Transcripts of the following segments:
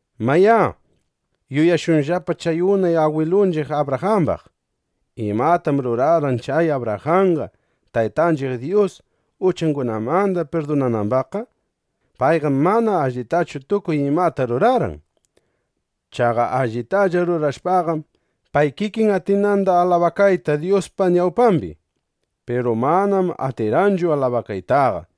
Mayá, yuyashunllapa chay unay agwilunchiq Abrajambaq. ¿Imatam rurarqan chay Abrajanqa, Taytanchiq Dyus uchangunamanda pirdunanambaqqa? Payqam mana allitachu tukuy imata rurarqan. Chaqa allitalla rurashpaqam, pay kikin atinanda alabakayta Dyuspa ñawpambi. Piru manam atirqanchu alabakaytaqa.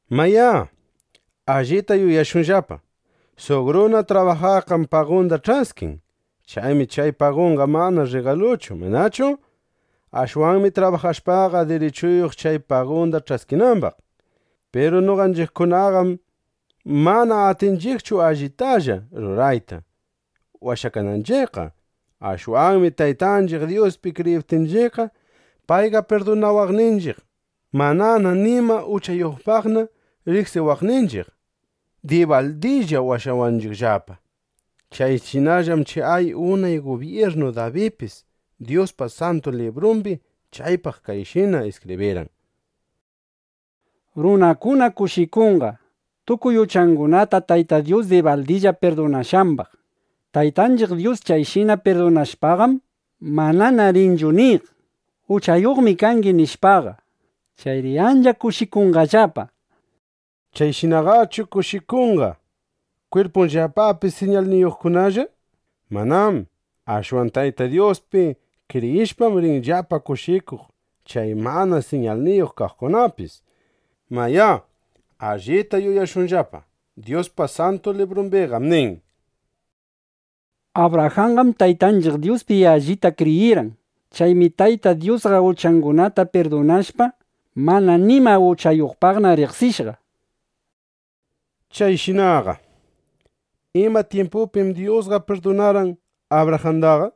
Mayá, allita yuyashunllapa: Suq runa trabajaqqam pagunda ch'askin. Chaymi chay pagunqa mana rrigaluchu, ¿manachu? Ashwanmi trabajashpaqa, dirichuyuq chay pagunda ch'askinambaq. (Piru noqanchiqkunaqam mana atinchiqchu allitalla rurayta washakananchiqqa.) Ashwanmi Taytanchiq Dyuspi kriyiptinchiqqa, payqa pirdunawaqninchiq, manana nima uchayuqpaqna riqsiwaqninchiq, dibaldilla washawanchiqllapa. Chayshinallam chay unay gubyirnu Dabidpis Dyuspa Santu Librumbi chaypaq kayshina iskibrirqan: Runakuna kushikunqa, tukuy uchangunata Tayta Dyus dibaldilla pirdunashqambaq. Taytanchiq Dyus chayshina pirdunashpaqam, manana rinchu niq: Uchayuqmi kangi, nishpaqa. Chayri ancha kushikunqallapa, nishpa. ¿Chayshinaqachu kushikunqa kwirpunllapapi siñalniyuqkunalla? ¡Manám! Ashwan Tayta Dyuspi kriyishpam, rinllapa kushikuq chay mana siñalniyuq kaqkunapis. Mayá, allita yuyashunllapa. Dyuspa Santu Librumbiqam nin: “Abrajanqam Taytanchiq Dyuspi allita kriyirqan. Chaymi Tayta Dyusqa uchangunata pirdunashpa, mana nima uchayuqpaqna riqsishqa”, nishpa. Chayshinaqa ¿ima tyimpupim Dyusqa pirdunarqan Abrajandaqa?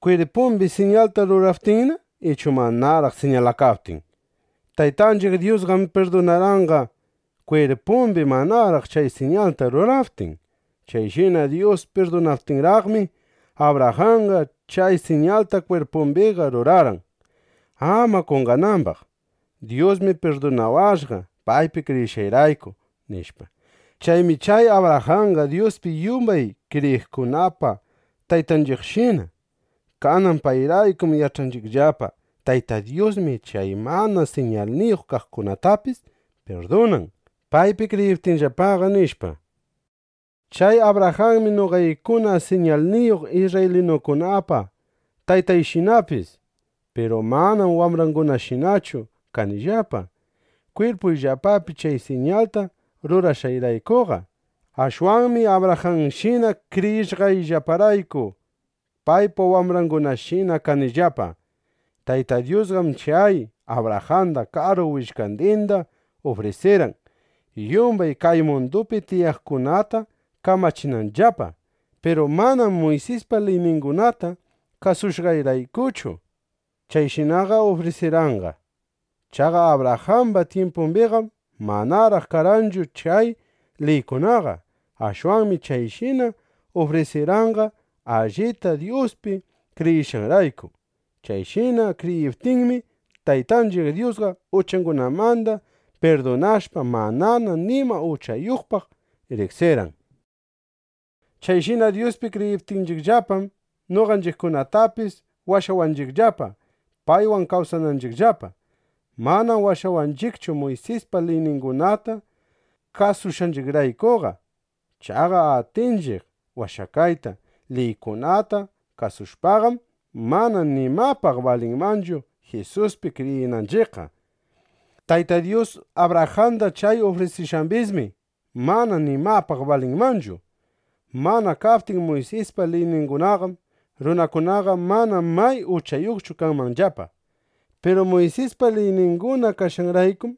¿Kwirpumbi siñalta ruraptinna, ichu manaraq siñalakaptin? Taytanchiq Dyusqam pirdunarqanqa, kwirpumbi manaraq chay siñalta ruraptin. Chayshina Dyus pirdunaptinraqmi, Abrajanqa chay siñalta kwirpumbiqa rurarqan, ama qonqanambaq: Dyusmi pirdunawashqa, paypi kriyishqayrayku, nishpa. Chaymi chay Abrajanqa Dyuspi yumbay kriyiqkunapa taytanchiqshina. Kanan payraykum yach'anchiqllapa: Tayta Dyusmi chay mana siñalniyuq kaqkunatapis pirdunan, paypi kriyiptinllapaqa, nishpa. Chay Abrajanmi noqaykuna siñalniyuq isrraylinukunapa taytayshinapis. Piru manam wambrangunashinachu kanillapa, kwirpuyllapapi chay siñalta rurashqayraykuqa. Ashwanmi Abrajanshina kriyishqayllaparayku, paypa wambrangunashina kanillapa. Tayta Dyusqam chay Abrajanda karu willkandinda ufrisirqan, yumbay kay mundupi tiyaqkunata kamachinanllapa. Piru manam Muysispa liyningunata kasushqanraykuchu, chayshinaqa ufrisirqanqa. (Chaqa Abrajamba tyimpumbiqam manaraq karqanchu chay liykunaqa.) Ashwanmi chayshina ufrisirqanqa, allita Dyuspi kriyishqanrayku. Chayshina kriyiptinmi, Taytanchiq Dyusqa uchangunamanda pirdunashpa, manana nima uchayuqpaq riqsirqan. Chayshina Dyuspi kriyiptinchiqllapam, noqanchiqkunatapis washawanchiqllapa, paywan kawsananchiqllapa. Manam washawanchiqchu Muysispa liyningunata kasushqanchiqraykuqa. Chaqa atiptinchiq washakayta, liykunata kasushpaqam, mana nimapaq balinmanchu Jisuspi kriyinanchiqqa. Tayta Dyus Abrajanda chay ufrisishqambismi mana nimapaq balinmanchu. Mana kaptin Muysispa liyningunaqam, runakunaqa mana may uchayuqchu kanmanllapa. Piru Muysispa liyninguna kashqanraykum,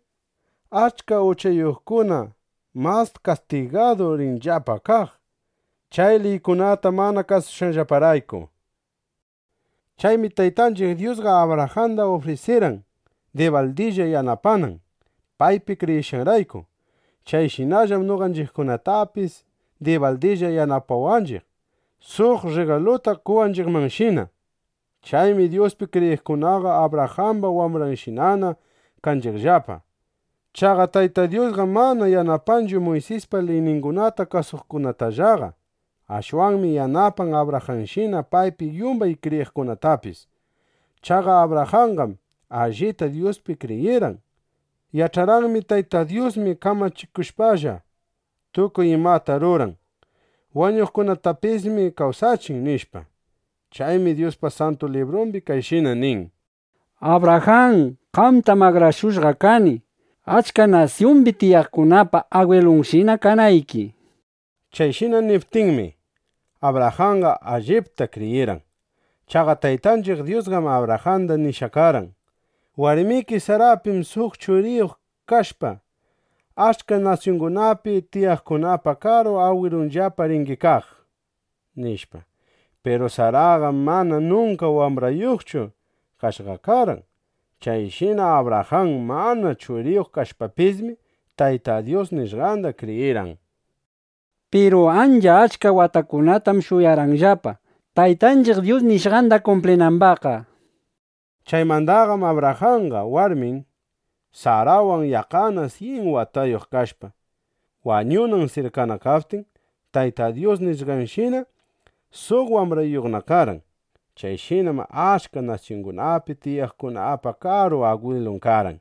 achka uchayuqkuna mas kastigadu rinllapa kaq, chay liykunata mana kasushqanllaparayku. Chaymi Taytanchiq Dyusqa Abrajanda ufrisirqan dibaldilla yanapanan, paypi kriyishqanrayku. Chayshinallam noqanchiqkunatapis dibaldilla yanapawanchiq, suq rrigaluta qowanchiqmanshina. Chaymi Dyuspi kriyiqkunaqa Abrajamba wambranshinana kanchiqllapa. Chaqa Tayta Dyusqam mana yanapanchu Muysispa liyningunata kasuqkunatallaqa. Ashwanmi yanapan Abrajanshina paypi yumbay kriyiqkunatapis. Chaqa Abrajanqam allita Dyuspi kriyirqan. Yach'arqanmi: Tayta Dyusmi kamachikushpalla, tukuy imata ruran. Wañuqkunatapismi kawsachin, nishpa. Chaymi Dyusqa Santu Librumbi kayshina nin: “Abrajan, qamtam akrashushqa kani, achka nasyumbi tiyaqkunapa agwilunshina kanayki”, nishpa. Chayshina niptinmi, Abrajanqa allipta kriyirqan. Chaqa Taytanchiq Dyusqam Abrajanda nishqa karqan: “Warmiki Sarapim suq churiyuq kashpa, achka nasyungunapi tiyaqkunapa karu agwilunllapa ringi kaq”, nishpa. Piru Saraqam mana nunka wambrayuqchu kashqa karqan. Chayshina Abrajan mana churiyuq kashpapismi, Tayta Dyus nishqanda kriyirqan. Piru ancha achka watakunatam shuyarqanllapa, Taytanchiq Dyus nishqanda kumplinambaqqa. Chaymandaqam Abrajanqa warmin Sarawan yaqqana syin watayuq kashpa, wañunan sirkana kaptin, Tayta Dyus nishqanshina, suq wambrayuqna karqan. Chayshinam achka nasyungunapi tiyaqkunapa karu agwilun karqan.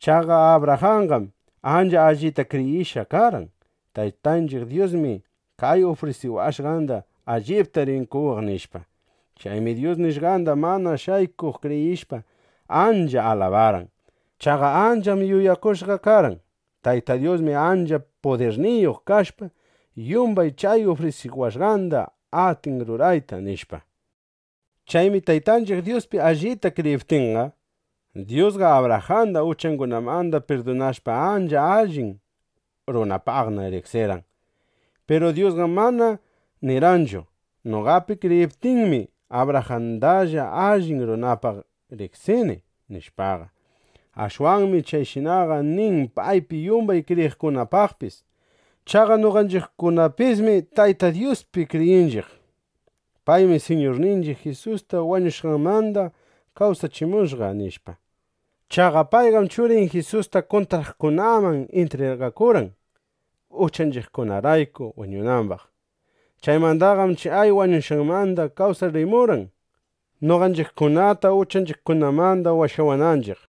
Chaqa Abrajanqam ancha allita kriyishqa karqan: Taytanchiq Dyusmi chay ufrisiwashqanda allipta rin qowaq, nishpa. Chaymi Dyus nishqanda mana shaykuq kriyishpa, ancha alabarqan. Chaqa ancham yuyakushqa karqan: Tayta Dyusmi ancha pudirniyuq kashpa, yumbay chay ufrisiwashqanda atin rurayta, nishpa. Chaymi Taytanchiq Dyuspi allita kriyiptinqa, Dyusqa Abrajanda uchangunamanda pirdunashpa, ancha allin runapaqna riqsirqan. Piru Dyusqam mana nirqanchu: “Noqapi kriyiptinmi, Abrajandalla allin runapaq riqsini”, nishpaqa. Ashwanmi chayshinaqa nin paypi yumbay kriyiqkunapaqpis. Chaqa noqanchiqkunapismi Tayta Dyuspi kriyinchiq: Paymi Siñurninchiq Jisusta wañushqanmanda kawsachimushqa, nishpa. Chaqa payqam Churin Jisusta kuntraqkunaman intrigakurqan, uchanchiqkunarayku wañunambaq. Chaymandaqam chay wañushqanmanda kawsachimurqan, noqanchiqkunata uchanchiqkunamanda washawananchiq.